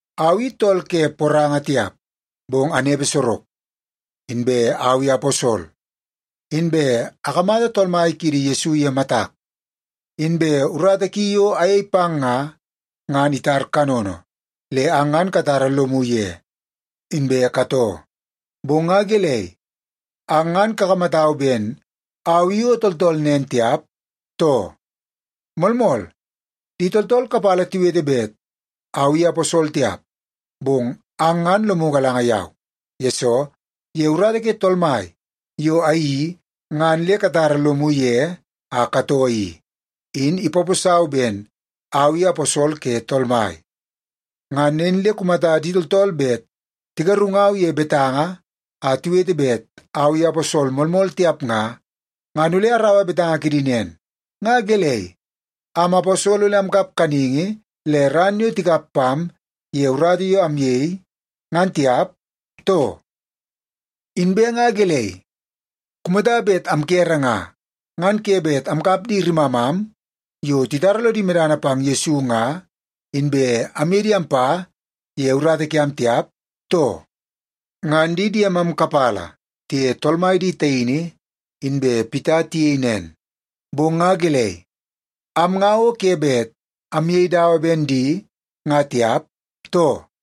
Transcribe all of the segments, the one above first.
Au i tool ke poranga tiap, bong anepe sorok. Inbe au i aposol. Inbe akamata Tool Mai kiidi Yesu ye matak. Inbe urata ki yo ayei pang nga, ngan itar kanono, le ang ngan katara lomu ye inbe katoo. Bong nga gelei, ang ngan kakamatau ben au i o tooltool nen tiap, too? Moolmool, di tooltool kapala tiwete bet au i aposol tiap, bong ang ngan lomu galanga yau. Yesoo, ye urata ke Tool Mai yo ayeii ngan le katara lomu ye a katoo i, in ipaposau ben au i aposol ke Tool Mai. Ngan nen le kumata di tooltool bet tigarungau ye betanga a tiwete bet au i aposol moolmool tiap nga, ngan ole araua betanga kidi nen. Nga gelei, am aposol ole amkap kaningi le ran yo tikap pam ye urata yo amyei, ngan tiap, too? Inbe nga gelei, kumata bet amkere nga, ngan ke bet amkap di rimamam yo titara lodi medana pang Yesu nga, inbe amye di ampa ye urata kiam tiap, too? Ngan di diemam kapala tiye Tool Mai di taini inbe Pita tiyei nen, bong nga gelei, am nga o ke bet amyei dawa ben di nga tiap, too?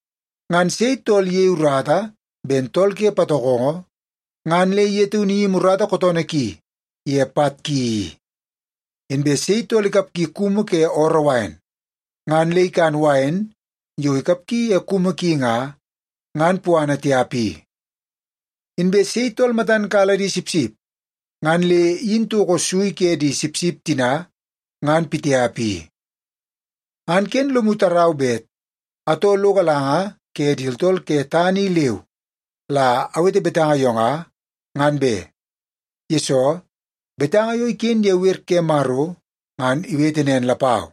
Ngan sei tool iyei urata ben tool ke patokongo, ngan le ye taunu iyimi urata kootoonoo ki ye pat ki i? Inbe sei tool ikapgi kumu ke ooroo wain, ngan le ikan wain yo ikapgi ye kumu ki nga, ngan puana tiap i? Inbe sei tool matan kala di sipsip, ngan le iyin toko sui ke di sipsip tina ngan pitiap i? Ngan ken lomu tarau bet atoo lo galanga ke di tooltool ke tana i leu la awete betanga yo nga, ngan be. Yesoo, betanga yo iken ye wer ke Maro ngan iwete nen lapau.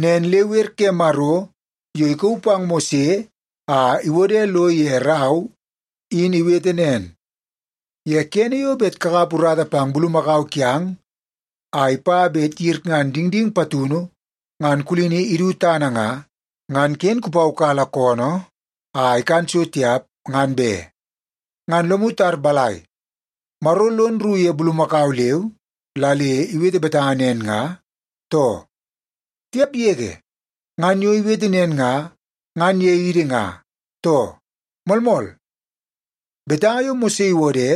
Nen le wer ke Maro yo ikauu pang Mose a iwode lo ye rau in iwete nen, “Ye kene yo bet kakap urata pang bulumakau kiang a ipa bet iyirngan dingding patunu ngan kulini idu tana nga, ngan ken kupaukala koonoo a ikan so tiap ngan be.” Ngan lomu tar balai, Maro lon rru ye bulumakau leu la le iwete betanga nen nga, too? Tiap yege! Ngan yo iwete nen nga, ngan ye idi nga, too? Moolmool, betanga yo Mose iwode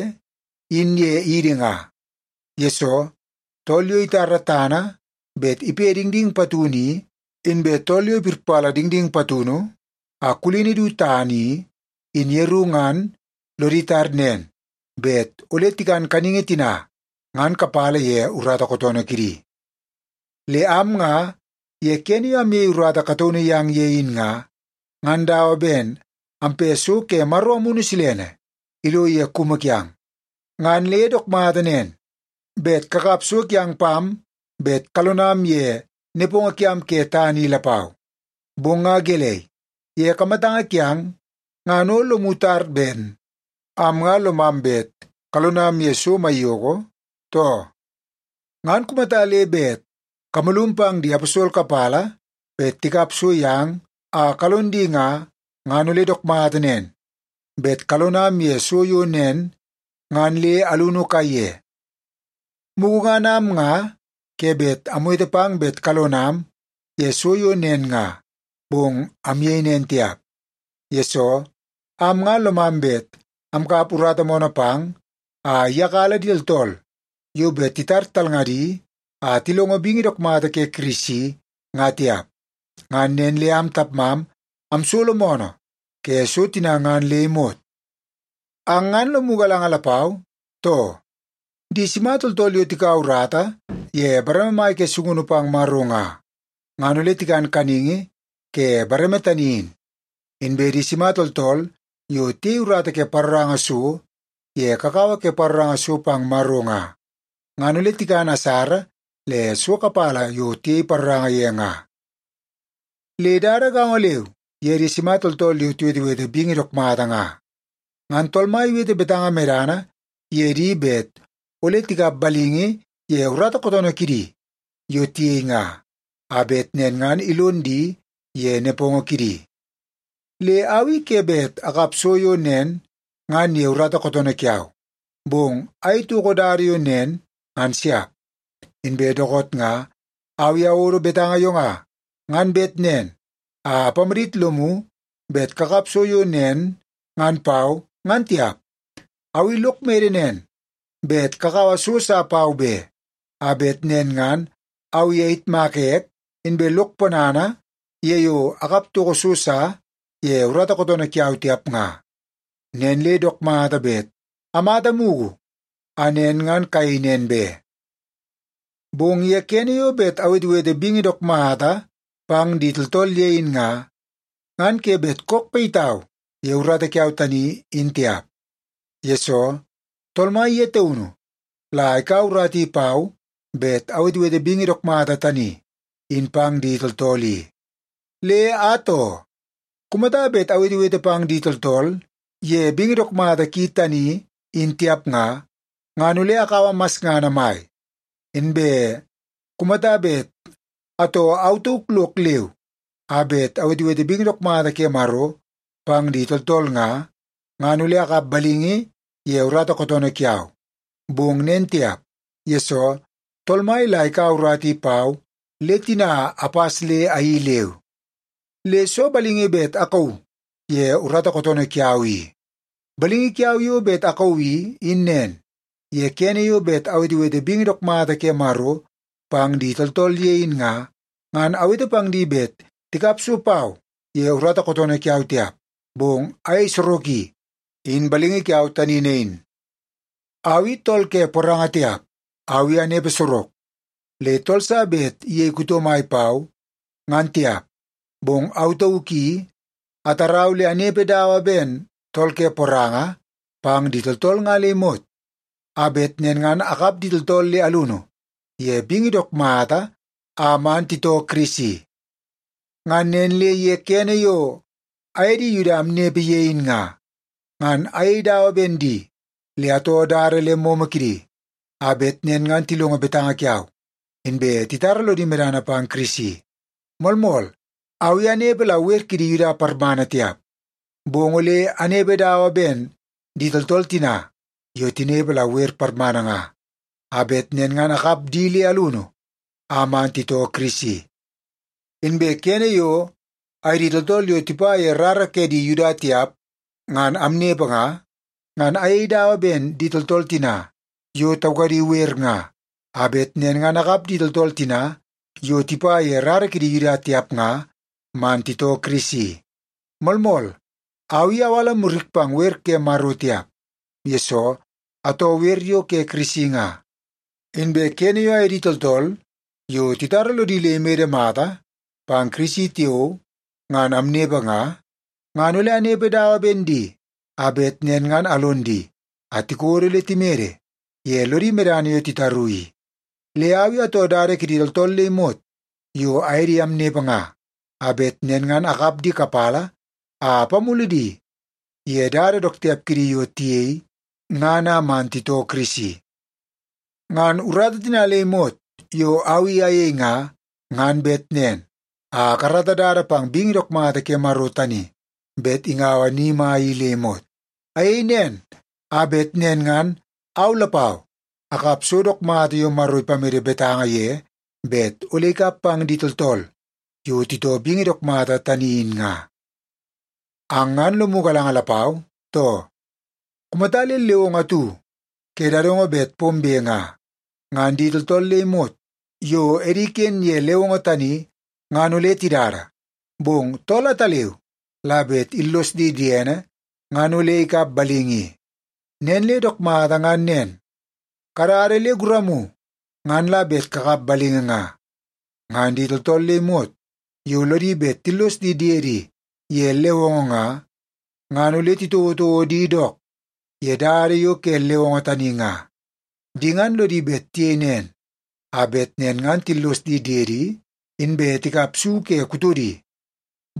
in ye idi nga. Yesoo, tool yo itara tana bet ipe dingding patunu i, inbe tool yo ipirpala dingding patunu a kulini du tana i, in yeru ngan lodi tar nen bet ole tikan kaningi tina ngan kapala ye urata kootoonoo kidi. Le am nga ye kene yo amyei urata kataunu yang ye in nga, ngan dawa ben ampe so ke Maro Amunu Silene ilo ye kumu kiang, ngan le dook mata nen bet kakap so kiang pam bet kalonam ye nepongo kiam ke tana i lapau. Bong nga gelei, ye kamatanga kiang ngan o lomu tar ben am nga lomam bet kalonam ye so maiyoko, too? Ngan kumata le bet kamalum pang di aposol kapala bet tikap so yang a kalon di nga, ngan ole dook mata nen bet kalonam ye so yo nen ngan le alunu kaiye. Mugu ngan am nga ke bet amwete pang bet kalonam ye so yo nen nga, bong amyei nen tiap, yesoo am nga lomam bet amkap urata moonoo pang a iyakala di tooltool yo bet titar talngadi a tilongo bingi dook mata ke Kirisi nga tiap. Ngan nen le am tapmam amsolo moonoo ke so tina ngan le imot. Ang ngan lomu galanga lapau, too? Di sima tooltool yo tikaua urata ye bareme mai ke sungunu pang Maro nga, ngan ole tikan kaningi ke bareme tani in. Inbe di sima tooltool yo tiyei urata ke paroranga so ye kakawa ke paroranga so pang Maro nga, ngan ole tikan asara le so kapala yo tiyei paroranga ye nga. Le dada gaongo leu ye di sima tooltool yo tiwetewete bingi dook mata nga. Ngan Tool Mai iwete betanga medana ye di bet ole tikap balingi ye urata kootoonoo kidi yo tiyei nga, a bet nen ngan ilon di ye nepongo kidi. Le au i ke bet akap so yo nen ngan ye urata kootoonoo kiau, bong ayei toko dada yo nen ngan siap. Inbe dookoot nga au i awodo betanga yo nga, ngan bet nen a apamadit lomu bet kakap so yo nen ngan pau, ngan tiap. Au i lok mede nen bet kakaua so sa pau be, a bet nen ngan au i ayitmaka ek inbe lok ponana ye yo akap toko so sa ye urata kootoonoo kiau tiap nga. Nen le dook mata bet amata mugu a nen ngan kayei nen be. Bong ye kene yo bet awetewete bingi dook mata pang di tooltool ye in nga, ngan ke bet kook payitau ye urata kiau tani, in tiap. Yesoo, Tool Mai ye taunu la ikaua urata i pau bet awetewete bingi dook mata tani in pang di tooltool i. Le atoo, kumata bet awetewete pang di tooltool ye bingi dook mata ki tani in tiap nga, ngan ole akaua masngana mai. Inbe kumata bet atoo au tauk lok leu a bet awetewete bingi dook mata ke Maro pang di tooltool nga, ngan ole akap balingi ye urata kootoonoo kiau. Bong nen tiap, yesoo Tool Mai la ikaua urata i pau le tina apas le ayeii leu. Le soo balingi bet akauu ye urata kootoonoo kiau i? Balingi kiau yo bet akauu i, in nen. Ye kene yo bet awetewete bingi dook mata ke Maro pang di tooltool ye in nga, ngan awete pang di bet tikap so pau ye urata kootoonoo kiau tiap, bong ayei soroki. In balingi kiau tani nain. Au i tool ke poranga tiap, au i anepe sorok, le tool sa bet iyei kuto mai pau, ngan tiap. Bong au tauk i atarau le anepe dawa ben tool ke poranga pang di tooltool nga le imot, a bet nen ngan akap di tooltool le alunu ye bingi dook mata a man titoo Kirisi. Ngan nen le ye kene yo aye di Yuda amnepe ye in nga, ngan ayei dawa ben di le atoo dada le momo kidi, a bet nen ngan tilongo betanga kiau, inbe titara lodi medana pang Kirisi. Moolmool, au i anepe la wer kidi Yuda parmana tiap, bong ole anepe dawa ben di tooltool tina yo tinepe la wer parmana nga, a bet nen ngan akap di le alunu a man titoo Kirisi. Inbe kene yo aye di tooltool yo tipa ye rara ke di Yuda tiap ngan amnepe nga, ngan ayei dawa ben di tooltool tina yo taukadi wer nga, a bet nen ngan akap di tooltool tina yo tipa ye rara kidi Yuda tiap nga man titoo Kirisi. Moolmool, au i awala murik pang wer ke Maro tiap, yesoo atoo wer yo ke Kirisi nga. Inbe kene yo aye di tooltool yo titara lodi le imede mata pang Kirisi tiao ngan amnepe nga, ngan ole anepe dawa ben di, a bet nen ngan alon di a tikodo le timede ye lodi medana yo titaru i. Le au i atoo dada kidi tooltool le imot yo aye di amnepe nga, a bet nen ngan akap di kapala a apamulu di ye dada dook tiap kidi yo tiyei ngan a man titoo Kirisi. Ngan urata tina le imot yo au i ayei nga, ngan bet nen a akarata dada pang bingi dook mata ke Maro tani bet ingaua ni mai i le imot. Ayei nen, a bet nen ngan au lapau akap so dook mata yo Maro ipamede betanga ye bet ole ikap pang di tooltool yo titoo bingi dook mata tani in nga. Ang ngan lomu galanga lapau, too? Kumata le lewongo atu ke dadongo bet pombe nga, ngan di tooltool le imot yo edi iken ye lewongo tani ngan ole tidada. Bong tool ataleu la bet illos di diene ngan ole ikap balingi i. Nen le dook mata ngan nen, kadada le guramu ngan la bet kakap balingi nga. Ngan di tooltool le imot yo lodi bet tillos di diedi ye lewongo nga, ngan ole titouotouo di dook ye dada yo ke lewongo tani nga. Di ngan lodi bet tiyei nen, a bet nen ngan tillos di diedi inbe tikap su ke kutodi.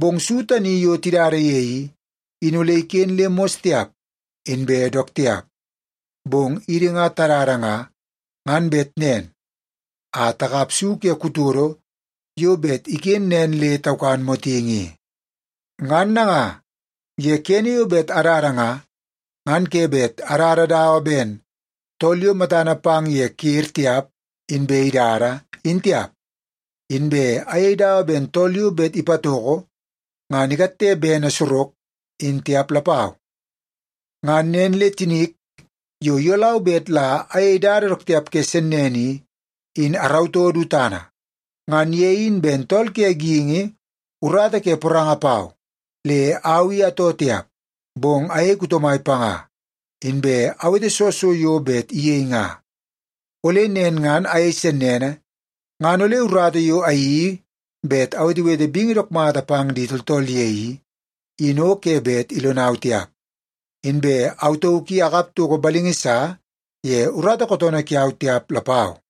Bong su tani yo tidada ye i, in ole iken le mos tiap inbe dook tiap. Bong idi nga tadada nga, ngan bet nen a takap su ke kutodo yo bet iken nen le taukan motingi i. Ngan nanga, ye kene yo bet adada nga, ngan ke bet adada dawa ben tool yo matana pang ye ker tiap inbe idada, in tiap. Inbe ayei dawa ben tool yo bet ipatoko ngan ikatte bene sorok, in tiap lapau. Ngan nen le tinik yo iyolau bet la ayei dada dook tiap ke sennene i, in arautoo du tana. Ngan ye in ben tool ke geingi urata ke poranga pau le au i atoo tiap, bong ayei kuto mai panga, inbe awete soo so yo bet iyei nga. Ole nen ngan ayei sennene ngan ole urata yo ayeii bet awetewete bingi dook mata pang di tooltool ye i, in o ke bet ilonau tiap, inbe au tauk i akap toko balingi sa ye urata kootoonoo kiau tiap lapau.